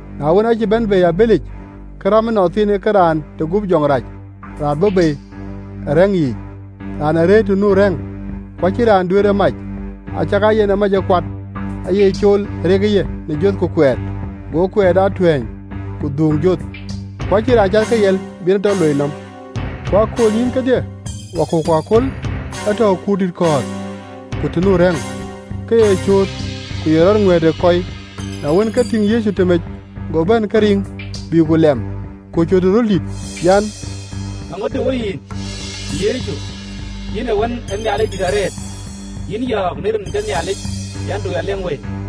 Na wën, aacï bɛ̈n bei ë abëlic, ke räm ënɔnthiinë ke raan de guöp jɔŋ rac raan bɔ̈ bei ë rɛ̈ŋ yiic, raan ee rëër të nu rɛ̈ŋ: ku acïn raan duëër e mac, acakaa yen ë mac ë kuat: aaye cool ë rekë ye në joth ku kuɛɛt, go kuɛɛt aa tuɛ̈ɛ̈ny ku dhuuŋ joth, ku acïn raan cath ke riɛl bï en e tɔ loi nɔm. Ku ë aköölnyïïn kedhie, wakɔ̈u ku aköl, ee tɔ̈u ë kuurdït kɔ̈ɔ̈th ku të nu rɛ̈ŋ, ke ye cööt, ku ye rɔt ŋuɛ̈ɛ̈t ë kɔi. Na wën, ke tïŋ Yecu tëmec, go bɛ̈n ke riŋ, bïï ku lɛm, ku cööt ë röl dït an, “Eeŋödï wo yïn? Yecu, yïn Wën ë Nhialic dït arëët! Yïn yɔ̈ɔ̈k në rin ke Nhialic, an, Du ya lui këtuc!”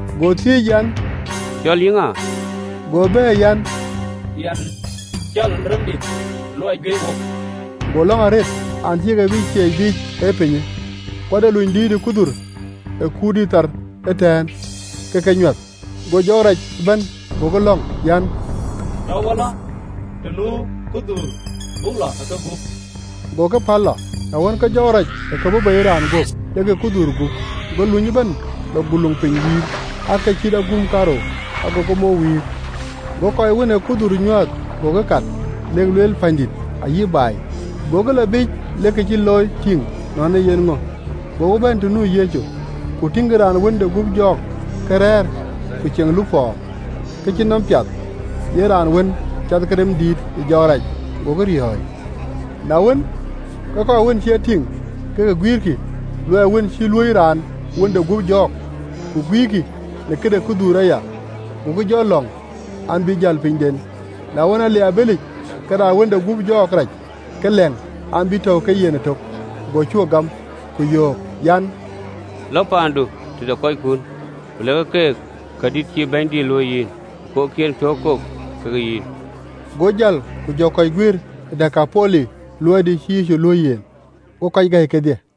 Go thiëëc an, “Cɔl yï ŋa?” Go bɛ̈ɛ̈r an, “Yɛn cɔl ‘Remdït’ luɔi juëc wok!” Go lɔ̈ŋ arëët an, acïï ke bï ciɛɛc biic ë pinyë. Ku ade luny dïït ë kudhuur ë kuurdït thar ëtɛ̈ɛ̈n, ke ke nyuäth. Go jɔɔk rac ëbɛ̈n gokï lɔ̈ŋ, an, “Tɔ wo lɔ të nu kudhuur buk lɔ ë kegup.” Go ke päl lɔ. Na wën, ke jɔɔk rac ë ke bɔ̈ bei ë raan guöp, lek ë kudhuur gup: go luny ëbɛ̈n lɔ guluŋ piny wïïr, cït aguum kaarou: agokï mou wïïr. Go kɔc wën ë kudhuur nyuääth gokï kat, lek lueel pänydït ayï baai. Gokï jɔ lɔ biic lek kë cï looi tïŋ, nɔn e yen ŋö. Gokï bɛ̈n të nu Yecu, ku tïŋkï raan wën de guöp jɔɔk, ke rɛ̈ɛ̈r, ku ceŋ lupɔ, ke cï nɔm piath, yen raan wën cath ke rem dïït ë jɔɔk rac, gokï riɔ̈ɔ̈c. Na wën, ke kɔc wën cï e tïŋ, ke ke guïïrkï luɔi wën cï luöi raan wën de guöp jɔɔk, ku guïïrkï në këde kudhuur aya. Gokï jɔ lɔŋ, an, bï jäl pinyden. Na wën, ale ë abëlic, ke raan wën de guöp jɔɔk rac ke lɛ̈ŋ, an, bï tɔ̈u ke yen ëtök. Go cuö gam, ku yöök an, “Lɔ paandu tëde kɔckun, ku lɛ̈kë keek kadït cïï Bɛ̈nydït luöi yïn, ku kok cï en piɔ̈u kok ke yïn. Go jäl, ku jɔ kɔc guiëër ë Dekapoli luɔi dïït cïï Yecu luöi yen, go kɔc gäi kedhie.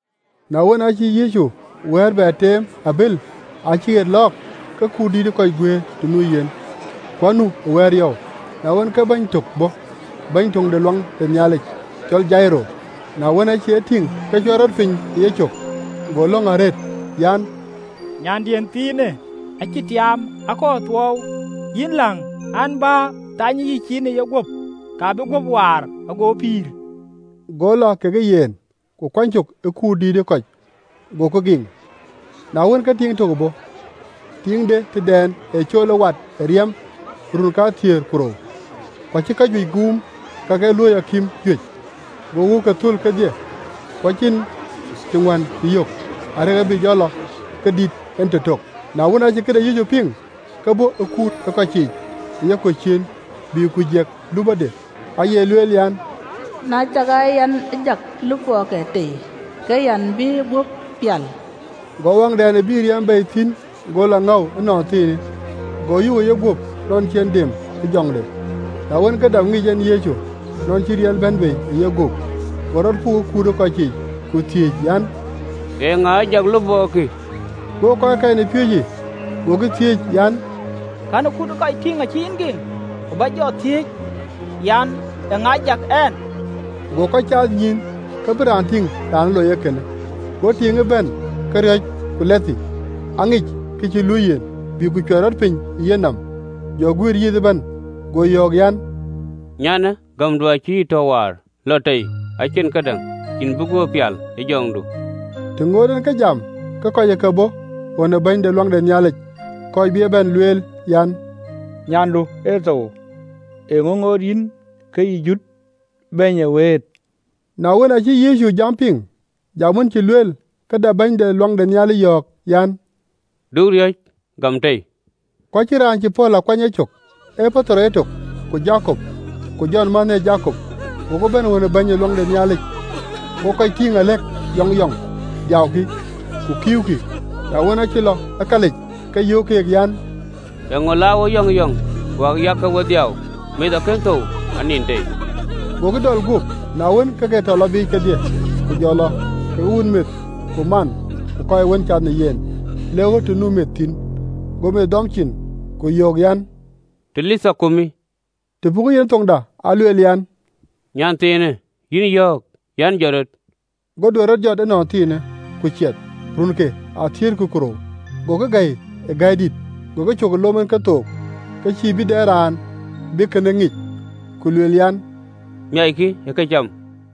Na wën, acï Yecu wɛ̈ɛ̈r bɛ teem ë abël, ku cï ɣet lɔɔk, ke kut dïït ë kɔc guëër të nu yen, ku anu ë wɛ̈ɛ̈r yɔu. Na wën, ke bɛ̈ny tök bɔ̈ bɛ̈ny töŋ de luaŋ de Nhialic, cɔl Jairo, na wën, aacï e tïŋ, ke cuɛt rɔt piny ë yecök, go lɔ̈ŋ arëët an, “Nyandiën thiinë acï tiaam akɔɔr thuɔɔu, yïn läŋ, an, bä, thanyë yïcin ë yeguöp, ke bï guöp waar, ago pïïr. Go lɔ kekë yen, ku kuany cök ë kut dïït ë kɔc, gokï giŋ. Na wën, ke tiiŋ tök bɔ̈, tiiŋ de tëdɛn ee cool ë wat ë riɛm ë run kathiëër ku rou, ku acï kajuëc guum kak ë looi akïm juëc, go wëuke thöl kedhie, ku acïn të ŋuän cï yök, arëk abï lɔ ke dït en tëtök. Na wën, acï këde Yecu piŋ, ke bɔ̈ ë kut ë kɔciic ë yekɔ̈u ciëën, bï ku jiɛk lupɔde. Aye lueel, an, “Na cakaa yɛn ë jak lupɔɔke tei, ke yɛn bï guöp pial.” Go awaŋdɛn ë bï riɛm bei thïn go lɔ ŋëu ënɔnthiinë, go yök ë yeguöp nɔn cï yen dem ë jɔŋde. Na wën, ke dap ŋic en Yecu nɔn cï riɛl bɛ̈n bei ë yeguöp, go rɔt puk ë kut ë kɔciic, ku thiëëc an, “Eeŋa ë jak lupɔɔkï?” Go kɔckɛn ë piööcë gokï thiëëc, an, “Kɛ̈në kut ë kɔc tïŋ acï yïn giŋ, ku bä jɔ thiëëc, an, eeŋa ë jak ɛn?” Go kɔc caath nyïïn, ke bï raan tïŋ raan ë loi kënë. Go tiiŋë bɛ̈n, ke riɔ̈c ku lɛthë, aŋic kë cï luöi yen, bï ku cuɛt rɔt piny ë yenɔm, jɔ guiëër yith ëbɛ̈n. Go yɔ̈ɔ̈k, an, “Nyanë, gämdu acï yï tɔ waar, lɔ tei ë ciën këdäŋ, yïn bï guöp pial ë jɔŋdu. Të ŋoot en ke jam, ke kɔc ë ke bɔ̈ ɣön ë bɛ̈ny de luaŋ de Nhialic, kɔc bï e bɛ̈n lueel, an, “Nyandu ë thou: eeŋö ŋoot yïn ke yï jut Bɛ̈ny ë wëët?” Na wën, acï Yecu jam piŋ, jam wën cï lueel, ke dap bɛ̈ny de luaŋ de Nhialic yɔ̈ɔ̈k, an, “Du riɔ̈c, gam tei.” Ku acïn raan cï pɔ̈l a kuany e cök, ee Petero etök, ku Jakop, ku Jɔn mänhë ë Jakop. Gokï bɛ̈n ɣön ë bɛ̈ny ë luaŋ de Nhialic, go kɔc tïŋ acïk nuɔɔn, adhiaukï ku kïïukï. Na wën, acï lɔ ë kalic, ke yöök keek, an, “Eeŋö cä wek nuɔɔn wäkya, ke we dhiau? Meth akën thou, anin tei.” Gokï dɔl guöp. Na wën ke ke tɔ lɔ biic kedhie, ku jɔ lɔ kekë wun meth ku man ku kɔc wën cath në yen, lek ɣöt të nu meth thïn. Go meth dɔm cin, ku yöök an, “Talitha kumi.” Të pukë yen ë thoŋda, alueel an, “Yïn nyanthiinë, jɔt rɔt.” Go duet rɔt jɔt ënɔnthiinë, ku ciɛth: runke athiëërkï ku rou. Gokï gäi ë gäi dït. Go ke cök ë lom en kethook, ke cïï bï dɛ raan bï kënë ŋic: ku lueel an, “Miackï ë këcam.”